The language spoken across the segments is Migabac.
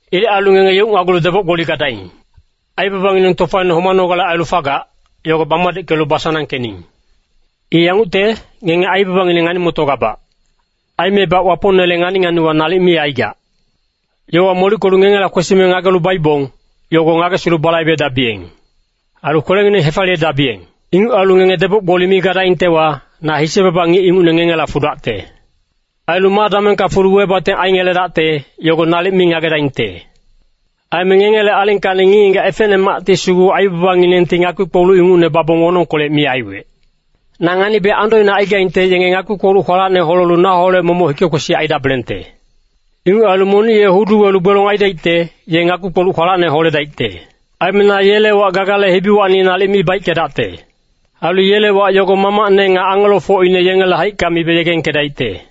Ilec ailu ngenge yeucnagulu deboc-gboli gadaing! Aibabangineng tofaine homanogale ailu fagac, yogo bamadickelu basanangkening. I yangucte, ngenge aibabangineng ngani-motogabac. Aimebac Wapongnele ngani-nganiwa nalic mi aigac. Yowa molickelu ngengela kwesime ngagelu baibong, yogo ngagesilu balaibedabiyeng. Ailu kwelengineng hefaliyedabiyeng. Inguc ailu ngenge deboc-gboli mi gadaingtewa, na hise-baba ngic ingucne ngengela fudacte. Ailu ma damengka fulu webating aingeledacte, yogo nalic mi ngagedaingte.’” “Aime ngengele alingkacni ngic-ngigac efecnemacti sugu aibabanginengti ngakpi-kpoluc ingucne babong wonongkolec mi aiwec. Na nganibe andoine aigaingte yenge ngakpi-kpoluc kwalacne holelu naholec momoc hike-kwesic aidabelengte. Inguc ailu monic ye hudu welu gbelong aidaicte, ye ngakpi-kpoluc kwalacne holedaicte. Aime na yele wac Gagale hibiwacni nalic mi baickedacte. Ailu yele wac yogo Mamacne nga angelofocine yengele haicka mibe yegengkedaicte.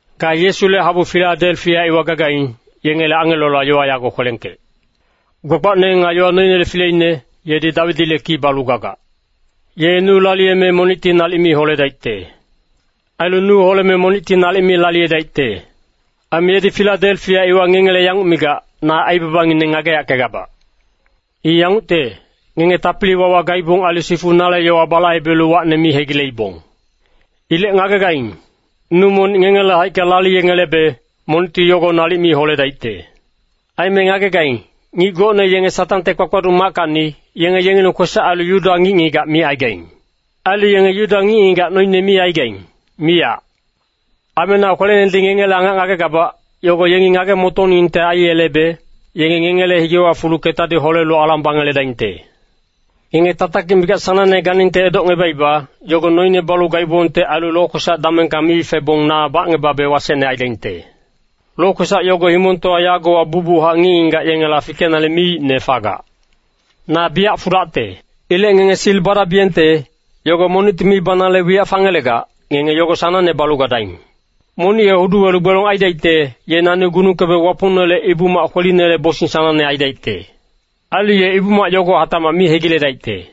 “Ga Yesule habu Filadelfia iwa gagaing, yengele angelola yowa yago kwelengkec.” “Gbagbacne nga yowa noinele fileine, yedi Dawidile ki balu gagac. Ye nu laliyeme monicti nalic mi holedaicte. Ailu nu holeme monicti nalic mi laliyedaicte. Aime yedi Filadelfia iwa ngengele yanguc migac, ‘Na aibabangineng ngageyackegabac. I yangucte, ngenge tapili-wawa gaibong ailu sifu nale yowa balaibelu wacne mi hegileibong. Ilec ngagegaing, nu monic ngengele haicka laliyengelebe, monicti yogo nalic mi holedaicte.’” “Aime ngagegaing, ngic gocne yenge Satangte kpakpaduc mackacni, yenge yengileng kwesac ailu Yuda ngic-ngigac micaigaing. Ailu yenge Yuda ngic-ngigac noine mi aigaing, miyac. Aime na kwelenedi ngengele angac ngagegabac, yogo yengi ngage-motoningte aiyelebe, yenge ngengele higewa fulu ketadi holelu alang bangeledaingte. Ngenge tatakic mikac sanangne ganingte edocngebaiba, yogo noine balu gaibongte ailu lokwesac damengka mi febong na bacngebabe wasecne aidaingte. Lokwesac yogo himongtowa yagowa bucbuchac ngic-ngigac yengela fikenale miicne fagac.” “Na biyac fudacte. Ilec ngenge sil badabiyengte, yogo monicti mi banale wiyac fangelegac, ngenge yogo sanangne balu gadaing. Monic ye hudu welu gbelong aidaicte, ye nani gunungkebe Wapongnele Ibu-mac kwelinele bosing sanangne aidaicte. Ailu ye Ibu-mac yogo hatacmac mi hegiledaicte.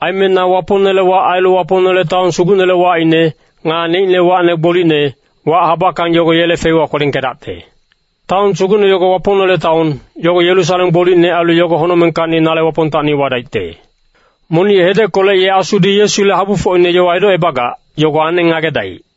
Aime na Wapongnele wac ailu Wapongnele taon sugucnele wacine, nga neicne wacne gbolicne, wac habackang yogo yele feiwa kwelengkedacte. Taon sugucne yogo Wapongnele taon, yogo Yerusalem gbolicne ailu yogo honocmengkacni nale Wapongtacni wadaicte.” “Monic hedeckolec ye Asudi Yesule habufocine yowa edocebagac, yogo aneng ngagedaic.”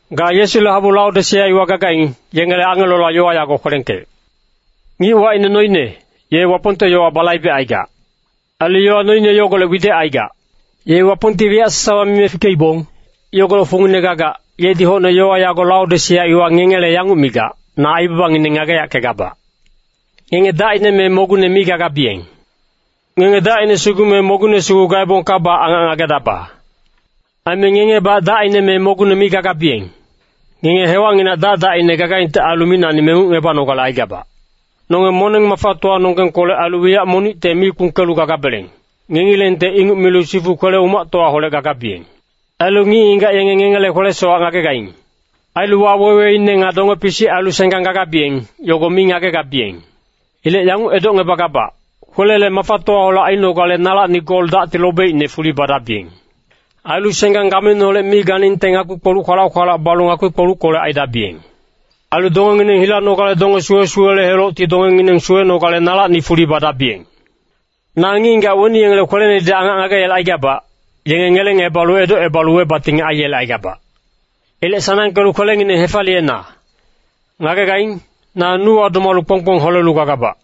“Ga Yesule habu Laodisea iwa gagaing, yengele angelola yowa yago kwelengkec.” “Ngic wacine Noine, ye Wapongte yowa balaibecaigac. Ailu yowa noine yogolec widec aigac. Ye Wapongti wiyac sasawa mime fikeibong, yogolec fungine gagac, yedi hocne yowa yago Laodisea iwa ngengele yanguc migac, ‘Na aibabangineng ngageyackegabac. Ngenge dacine me mogungne mi gagabiyeng. Ngenge dacine sugu me mogungne sugu gaebongkabac angac ngagedaba. Aime ngengebac dacine me mogungne mi gagabiyeng. Ngenge hewacnginac dac-dacine gagaingte ailu micnacni mengucngebanogale aigabac. Nonge moneng-mafatowanonggengkolec ailu wiyac monicte mi kpungkelu gagabeleng, ngengilengte inguc milu sifu kwele-umactowaholec gagabiyeng. Ailu ngic-ngigac yenge ngengele kwele-sowac ngagegaing. Ailu waweweine nga donge-pisic ailu senggang gagabiyeng, yogo mi ngagegabiyeng. Ilec yanguc edocngebagabac, kwelele mafatowaholec ainogale nalacni gol dacti lobeicne fuli badabiyeng. Ailu senggang gameineholec mi ganingte ngakpi-kpoluc kwalac-kwalac balu ngakpi-kpoluckolec aidabiyeng. Ailu dongengineng hilanogale donge suwe-suwele helocti dongengineng suwenogale nalacni fuli badabiyeng.’” “Na ngic-ngigac weni yengele kwelenedi angac ngageyelecaigabac, yenge ngelengebalu edocebalu webating aiyelecaigabac. Ilec sanangkelu kwelengineng hefaliyena. Ngagegaing, na nuwa domalu kpong-kpong holelu gagabac.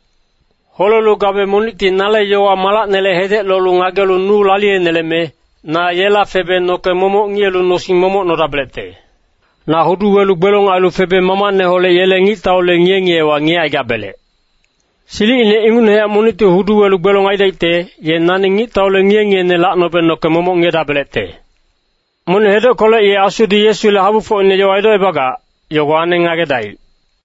Holelu gabe monicti nale yowa-malacnele hedec lolu ngagelu nu laliyeneleme, na yela febe noke momoc ngiyelu nosing momoc nodabelecte.” “Na hudu welu gbelong ailu febe Mamacneholec yele ngictaule ngiye-ngiyewa ngiyecaigabelec. Silicine ingucnehac monicti hudu welu gbelong aidaicte, ye nani ngictaule ngiye-ngiyene lacnobe noke momoc ngiyedabelecte. Monic hedeckolec ye Asudi Yesule habufocine yowa edocebagac, yogo aneng ngagedaic.”